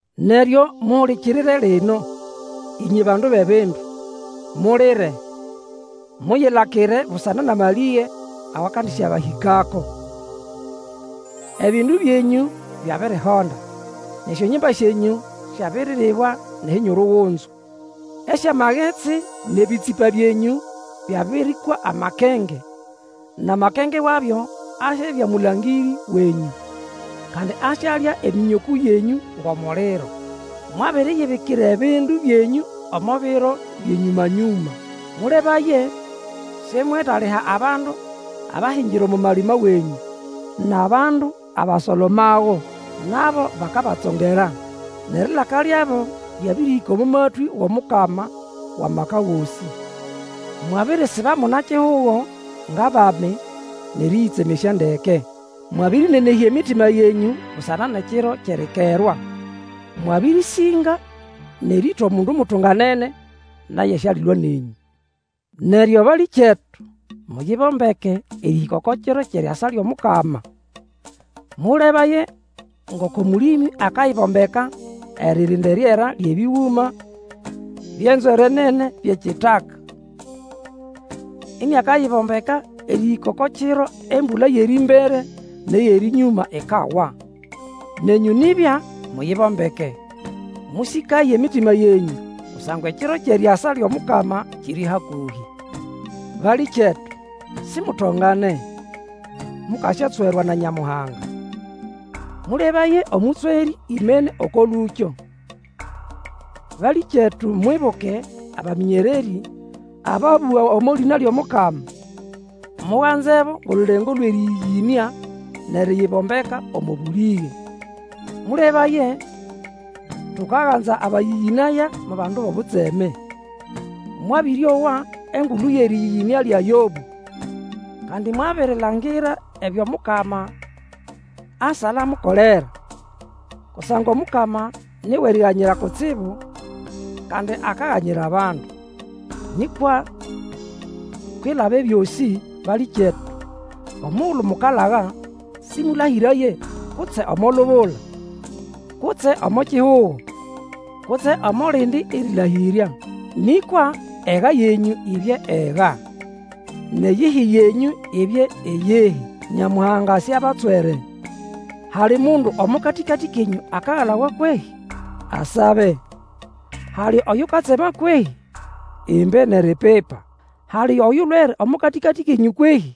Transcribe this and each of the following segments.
Neryo muhulikirire lino, ĩnywe bandu bʼebindu! Mulire, muyilakire busana nʼamalĩge awakandĩsyabahĩkako. Ebindu byenyũ byabirihonda, nʼesyongimba syenyũ syabiriribwa nʼehinyurugunzu. Esyamagetsi nʼebĩtsĩpa byenyũ, byabĩrĩhwa amakenge, nʼamakenge wabyo asyabya mũlangĩrĩ wenyũ, kandi asyalya emĩnyokũ yenyũ ngʼomuliro. Mwabiriyibikira ebindu byenyũ omo biro byʼenyũma-nyũma. Mũlebaye, simwetaliha abandu abahingira omo malima wenyũ, nʼabandu abasolomago. Nabo bakabatsongera. Nʼerilaka lyabo lyabĩrĩhĩka omo matwĩ wʼOmukama wʼAmaka Gosĩ. Mwabirisiba muna-kihugo ngʼabami, nʼerĩyĩtsemesya ndeke. Mwabĩrĩnenehya emitima yenyũ busana nʼekiro kyʼerikerwa. Mwabĩrĩsĩnga nʼerĩĩta omundu mutunganene; naye sialilwa nenyũ. Neryo balĩkyetu, muyibombeke erĩhĩka oko kiro kyʼeriasa lyʼomukama. Mũlebaye ngoko mũlĩmĩ akayibombeka, eririnda eriera lyʼebĩgũma byʼenzwere nene byʼekitaka, iniakayibombeka erĩhĩka oko kiro embũla yʼerĩmbere nʼeyʼerĩnyũma ikawa. Nenyũ nibya, muyibombeke! Mũsĩkaye emitima yenyũ, kusangwa ekiro kyʼeriasa lyʼomukama kiri hakũhĩ. Balĩkyetu, simutongane, mukasyatswerwa na Nyamuhanga. Mũlebaye, omũtswerĩ imene oko lũkyo. Balĩkyetu mwibuke abamĩnyererĩ, ababũga omo lĩna lyʼomukama. Muganzebo ngʼolulengo lwʼerĩyĩyĩnĩa, nʼeriyibombeka omo bũlĩge. Mũlebaye, tukaganza abayĩyĩnaya mo bandu bʼobutseme. Mwabĩrĩowa engulu yʼerĩyĩyĩnĩa lya Yobũ, kandi mwabirilangira ebyo Mukama asala amukolera. Kusangwa Omukama ni wʼeriganyira kutsibu, kandi akaganyira abandu. Nĩkwa kwilaba ebyosĩ, balĩkyetu, omugulu mukalaga, sĩmũlahĩraye kutse omo lubula, kutse omo kihugo, kutse omo lindi erĩlahĩrya. Nĩkwa ega yenyũ ibye ega, nʼeyihi yenyũ ibye iyihi, Nyamuhanga siabatswere. Hali mundu omo katĩkatĩ kenyũ akagalawa kwehĩ? Asabe. Hali Oyukatsema kwehĩ? Imbe nʼeripipa. Hali oyulwere omo katĩkatĩ kenyũ kwehĩ?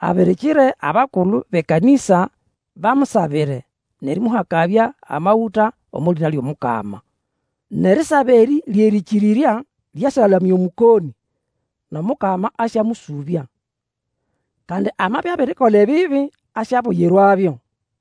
Abirikire abakulu bʼekanĩsa, bamusabire, nʼerĩmũhakabya amagũta omo lĩna lyʼomukama. Nʼerisaba erĩ lyʼerĩkĩrĩrya lyasyalamya Omũkonĩ, nʼOmukama asyamũsũbya. Kandi amabya abirikola ebibi, asyabuyirwabyo.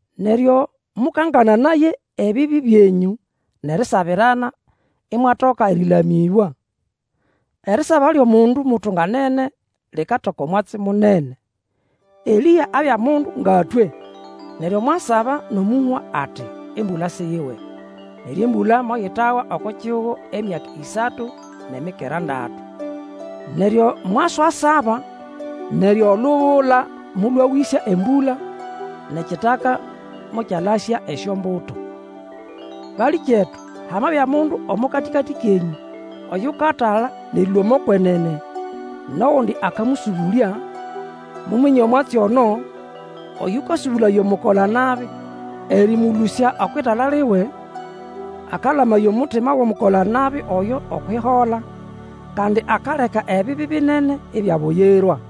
Neryo mũkangananaye ebibi byenyũ, nʼerisabirana, imwatoka erĩlamĩbwa. Erisaba lyʼomundu mutunganene likatoka omwatsi munene. Elĩa abya mundu nga twe, neryo mwasaba nʼomũhwa ati, embũla siyiwe. Neryo embũla moyitawa oko kihugo emyaka ĩsatu nʼemikera ndatu. Neryo mwaswasaba neryo olubula molwawĩsya embũla, nʼekitaka mokyalasya esyombuto. Balĩkyetu, hamabya mundu omo katĩkatĩ kenyũ oyukatala nʼerĩlũa omo kwenene, nʼogundi akamũsũbũlya; muminye omwatsi ono, oyũkasũbũlaya omukola-nabi erĩmũlũsya okwʼitala liwe, akalamaya omutima wʼomukola-nabi oyo okwʼihola, kandi akaleka ebibi binene ibyabuyirwa.